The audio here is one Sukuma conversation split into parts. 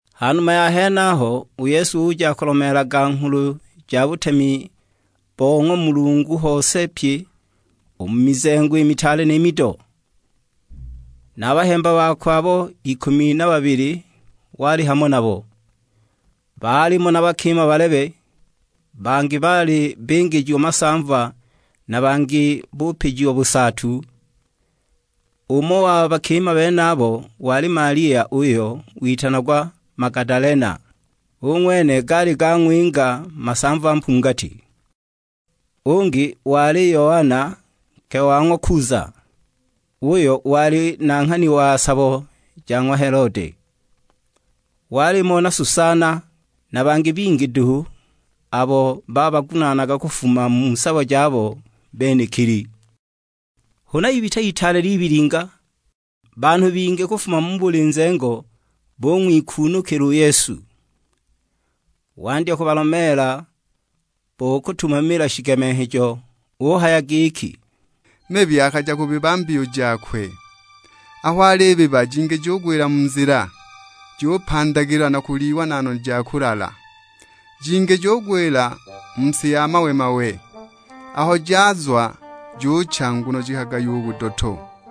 Ha numa ya henaho, u Yesu uja akulomeelaga Nghulu ja butemi bo ng'wa Mulungu hose pye u mu mizengo i mitaale ni mido. Na a bahemba bakwe abo ikumi na babili wali hamo nabo. Baalimo na bakima balebe, bangi baali bingijiwa masamva na bangi bupijiwa busaatu; umo wa bakima benabo wali Malia uyo witanagwa Magadalena, u ng'wene gaali gang'winga masamva mpungati. Ungi wali Yoana nke wa ng'wa Kuza, uyo wali nanghani wa sabo ja ng'wa Helode. Walimo na Susana, na bangi bingi duhu, abo babagunaanaga kufuma mu sabo jabo benekili. Huna ibita itaale libilinga, banhu bingi kufuma mu buli nzengo bung'wikuunukila u Yesu. Wandya kubalomeela bo kutumamila shigemenghejo; uhaya giki, "Mibi akaja kubiba mbiyu jakwe. Aho alibiba jingi jugwila mu nzila, jupandagilwa na kulyiwa na noni ja kulala. Jingi jugwila mu si ya mawe-mawe; aho jazwa jucha nguno jikagayiwa u budoto.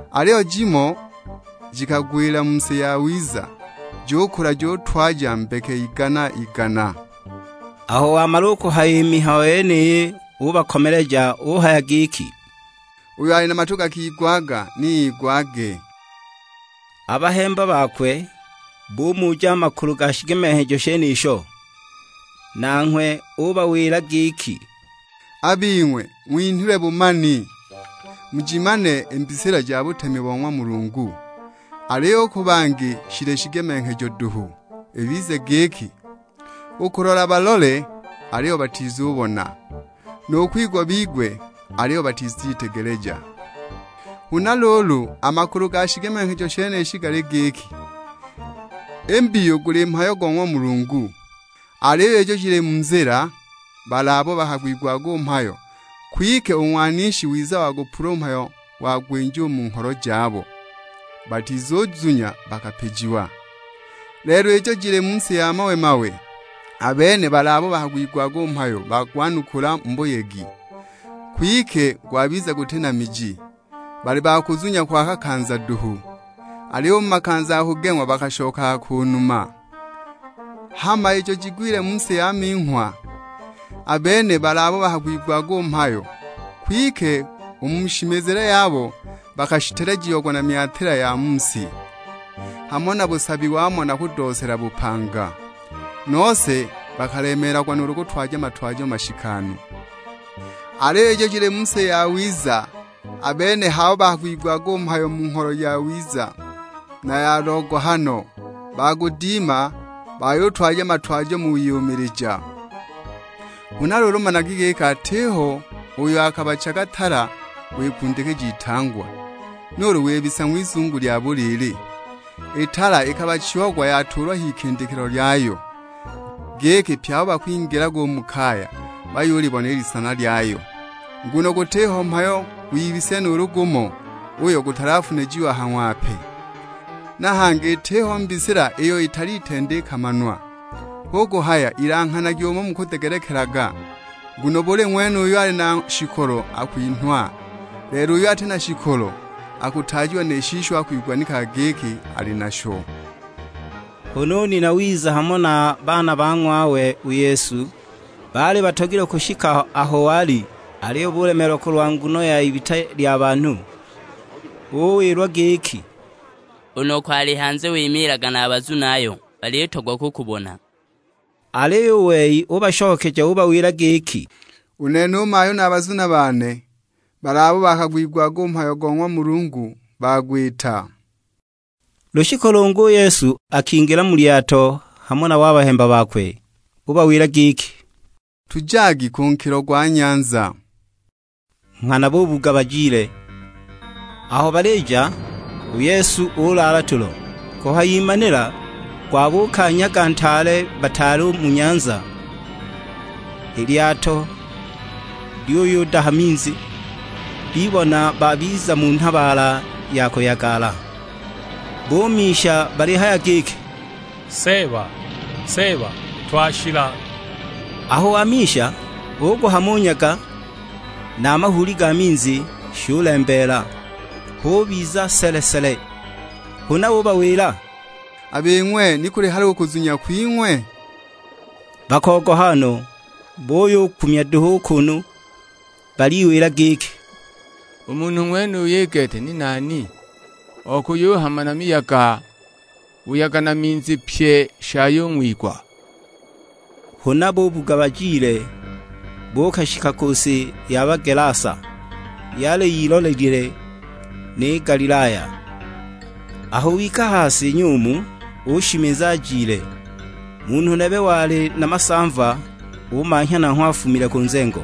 Aliyo jimo jikagwila mu si yawiza, jukula jutwaja mbeke igana-igana." Aho wamala u kuhaya i mihayo yeniyi ubakomeleja; uhaya giki, "Uyo ali na matu gakigwaga ni igwage." A bahemba bakwe bumuja a makulu ga shigemenghejo shenisho. Nanghwe ubawila giki, "A bing'we ng'winhilwe bumani, mujimane i mbisila ja butemi bo ng'wa Mulungu, aliyo u ku bangi shili shigemenghejo duhu; ibize giki, 'u kulola balole, aliyo batizubona; nu kwigwa bigwe, aliyo batizitegeleja.' " "Huna luulu, a makulu ga shigemenghejo shenishi gali giki, i mbiyu guli mhayo go ng'wa Mulungu. Aliyo ijo jili mu nzila, bali abo bakagwigwaga u mhayo; kwike u Ng'wanishi wiza wagupula u mhayo wagwinja u mu ngholo jabo, batizuzunya bakapijiwa. Lelo ijo jili mu si ya mawe-mawe, a bene bali abo bakagwigwaga u mhayo bagwanukula mu buyegi, kwike gwabiza guti na miji. Bali ba kuzunya kwa kakanza duhu, aliyo u mu makanza ga kugeng'wa bakashokaga ku numa. Hama ijo jigwilile mu si ya minghwa, a bene bali abo bakagwigwaga u mhayo; kwike u mu shimizile yabo bakashitelejiagwa na myatila ya mu si, hamo na busabi wamo na kudoosela bupanga, nose bakalemeelagwa nuulu kutwaja matwajo mashikanu. Aliyo ijo jili mu si yawiza, a bene h'abo bakagwigwaga u mhayo mu ngholo yawiza na ya logohano, bagudima; bayutwaja matwajo mu wiyumilija." "Huna luulu managi giki atiho uyo akabachaga tala wikundikija itangwa, nuulu wibisa ng'wizungu lya buliili. I tala ikabachiagwa yatuulwa h'ikindikilo lyayo, giki pye abo bakwingilaga u mu kaya bayulibona i lisana lyayo. Nguno gutiho mhayo gwibisile nuulu gumo, uyo gutalafunijiwa ha ng'wape! Na hangi itiho mbisila iyo italitenda ikamanwa. Hu kuhaya ilanghanagi umo mukudegelekelaga; nguno buli ng'wene uyo ali na shikolo akwinhwa, lelo uyo ati na shikolo, akutaajiwa ni shisho akwiganikaga giki ali nasho." Huna u nina wiza hamo na a baana ba ng'wawe u Yesu, baali batogilwe kushika aho wali, aliyo bulemeelwa kulwa nguno y'ibita lya banhu. Uwilwa giki, "U noko ali hanze wimiilaga na a bazunayo; balitogwa kukubona." Aliyo u wei ubashokeja ubawila giki, "U nene u mayu na a bazuna bane, bali abo bakagwigwaga u mhayo go ng'wa Mulungu bagwita." Lushiku lungi u Yesu akingila mu lyato hamo nabo a bahemba bakwe; ubawila giki, "Tujagi ku nkilo gwa nyanza;" na nghana bubuga bajile. Aho balija, u Yesu ulaala tulo. Kuhayimanila gwabuuka nyaga ntaale bataali u mu nyanza. I lyato lyuyudaha minzi, bibona babiza mu nhabaala ya kuyagala. Bumisha balihaya giki, "Seeba, Seeba, twashila!" Aho wamisha, uguhama u nyaga na a mahuuli ga minzi, shulembeela, hubiza sele-sele. Huna ubawila, "A bing'we ni kuli hali u kuzunya kwing'we?" Bakogoha no, buyukumya duhu u kunu baliwila giki, "U munhu ng'wenuyu i gete ni nani okuyuhama na miyaga, buyaga na minzi pye shayung'wigwa!" Huna bubuga bajile, buukashika ku si ya Bagelasa, yali yilolile ni Galilaya. Aho wika ha si nyumu ushimiza ajile, munhu nebe wali na masamva umanhya nanghwe afumile ku nzengo.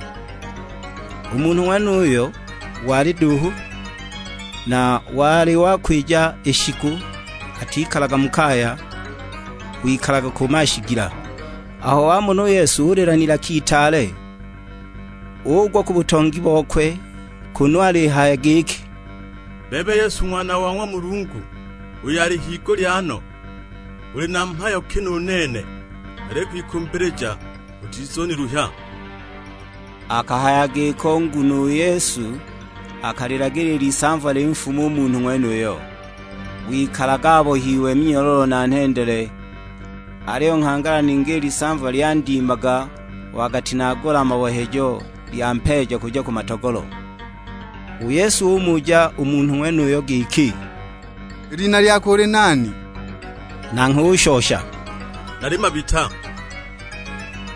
U munhu ng'wenuyo wali duuhu, na wali wakwija i shiku atikalaga mu kaya, wikalaga ku mashigila. Aho wamona u Yesu ulila n'ilaka itaale; ugwa ku butongi bokwe kunu alihaya giki, "Bebe Yesu Ng'wana wa ng'wa Mulungu uyo ali higulya no, uli na mhayo ki nu nene? Nalikwikumbilija utizuniluhya!" Akahaya giko nguno u Yesu akalilagila i lisamva linfume u munhu ng'wenuyo. Wikalaga abohiwe minyololo na nhendele, aliyo nghangala ningi i lisamva lyandimaga wagatinagula a mabohejo, lyampeeja kuja ku matogolo. U Yesu umuja u munhu ng'wenuyo giki, "I lina lyako uli nani?" Nanghwe ushosha, "Nali Mabita,"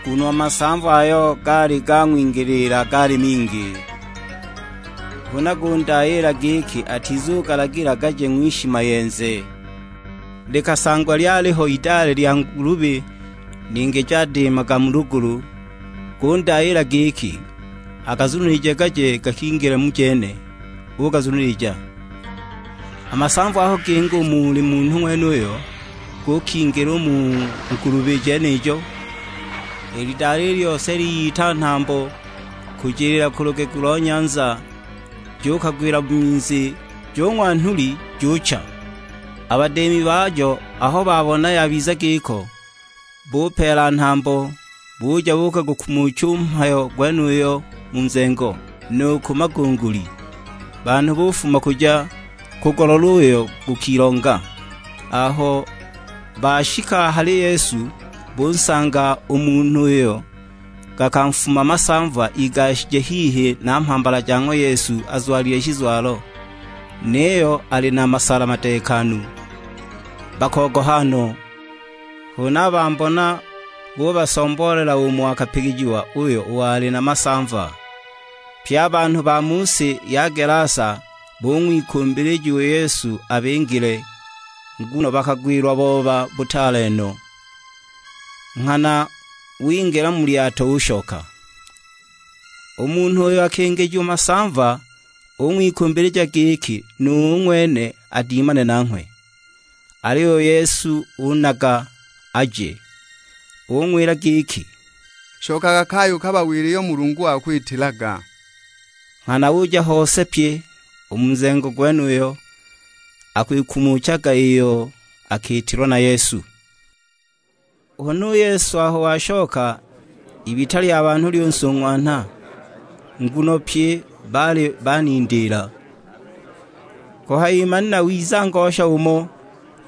nguno a masamva ayo gaali gang'wingiliila gaali mingi. Huna gundayiila giki atizugalagila gaje ng'wishimayenze. Likasangwa lyaliho idale lya ngulubi ningi jadiimaga mu lugulu, gundayiila giki agazunilije gaje gakingile mu jene; ugazunilija. A masamva aho ginga u muli munhu ng'wenuyo, gukingila u mu ngulubi jenijo; i lidale i lyose liyita nhambo kujiliila ku lugegu lo nyanza, jukagwila mu minzi, jung'wa nhuli, jucha! A badiimi bajo aho babona yabiza giko, bupeela nhambo, buja buukagukumucha u mhayo gwenuyo mu nzengo, nu ku magunguli. Banhu bufuma kuja kugulola uyo gukilonga, aho bashika a hali Yesu bunsanga u munhu uyo gakanfuma masamva igashije hihi na mhambala ja ng'wa Yesu azwalile shizwalo, niyo ali na masala madeekanu. Bakogoha no! Huna a bambona bubasomboolela umo akapigijiwa uyo wali na masamva. Pye a banhu ba mu si ya Gelasa bung'wikumbilija u Yesu abingile, nguno bakagwilwa booba butaale no; nghana wingila mu lyato ushoka. U munhu uyo akingijiwa masamva ung'wikumbilija giki nu ng'wene adimane nanghwe. Aliyo u Yesu unaga aje; ung'wila giki, "Shokaga kaya ukabawile iyo Mulungu wakwitilaga." Nghana uja hose pye u mu nzengo gwenuyo, akwikumuchaga iyo akiitilwa na Yesu. Huna u Yesu aho washoka, ibita lya banhu lyunsung'wanha, nguno pye baali banindiila. Kuhayimanila wiza ngosha umo,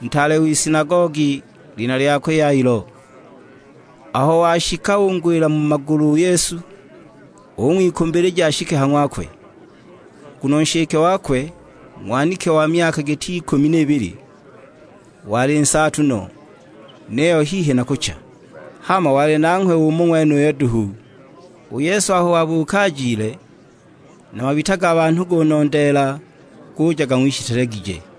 ntaale w'isinagogi; lina lyakwe Yailo. Aho washika ungwila mu magulu u Yesu, ung'wikumbilija ashike ha ng'wakwe. Nguno nshike wakwe, ng'waniki wa myaka giti ikumi n'ibili, wali nsaatu no; niyo hihi na kucha. Hama wali nanghwe umo ng'wenuyo duhu. U Yesu aho wabuuka ajile, na mabita ga banhu gunondeela, guja gang'wishitelegije.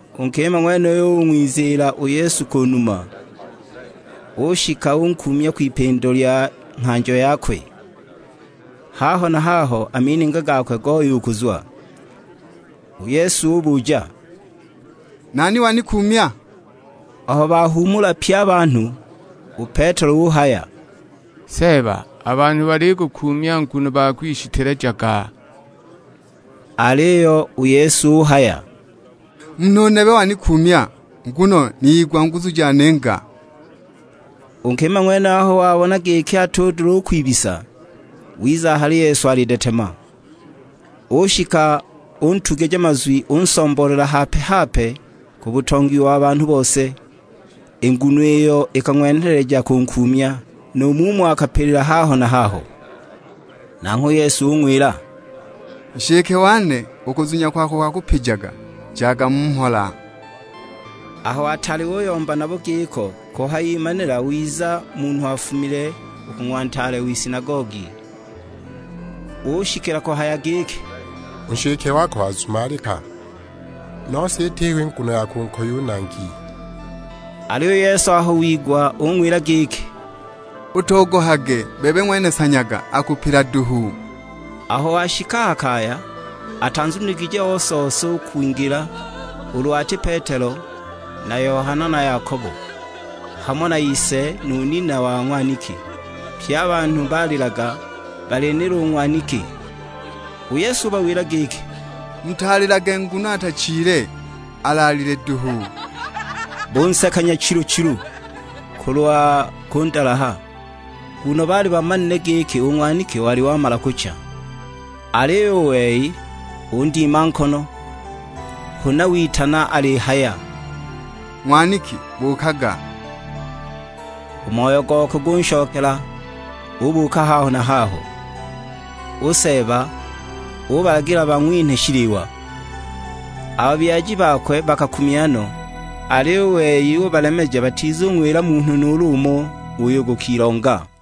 U nkima ng'wenuyo ung'wiziila u Yesu ku numa, ushika unkuumya kwipindo lya nghanjo yakwe; haho na haho a mininga gakwe goya u kuzwa. U Yesu ubuja, "Nani wanikuumya?" Aho bahuumula pye a banhu, u Petelo uhaya, "Seeba, a banhu balikukuumya nguno bakwishitelejaga!" Aliyo u Yesu uhaya, "Munhu nebe wanikuumya, nguno niyigwa nguzu janinga." U nkima ng'wenuyo aho wabona giki atudula u kwibisa, wiza a hali Yesu alidetema, ushika untugija mazwi unsomboolela hape-hape ku butongi wa banhu bose, i nguno iyo ikang'wenheleja kunkuumya, nu mumo akapilila haho na haho. Nanghwe u Yesu ung'wila, "Nshike wane, u kuzunya kwako kwakupijaga; jaga mu mhola." Aho ataali uyomba nabo giko, kuhayimanila wiza munhu afumile u ku ng'wa ntaale w'isinagogi; ushikila kuhaya giki, "U nshike wako wazumalika, nose itiho nguno ya kunkoya u Nangi!" Aliyo u Yesu aho wigwa ung'wila giki "Utogohage, bebe ng'wene sanyaga, akupila duhu." Aho washika a ha kaya, atanzuniligije ose-ose u kwingila, ulu ati Petelo na Yohana na Yakobo; hamo na ise nu nina wa ng'waniki. Pye a banhu balilaga, balinila u ng'waniki! U Yesu ubawila giki, "Mutalilage nguno atachile, alaalile duhu." Bunseka nyachilu-chilu kulwa kundalaha, nguno baali bamanile giki u ng'waniki wali wamala kucha. Aliyo u wei undima nkono; huna witana alihaya, "Ng'waniki, buukaga!" U moyo gokwe gunshokela, ubuuka haho na haho. U Seeba ubalagila bang'winhe shiliwa. A babyaji bakwe bakakumya no; aliyo u wei ubalemeja batizung'wila munhu nuulu umo uyo gukilonga.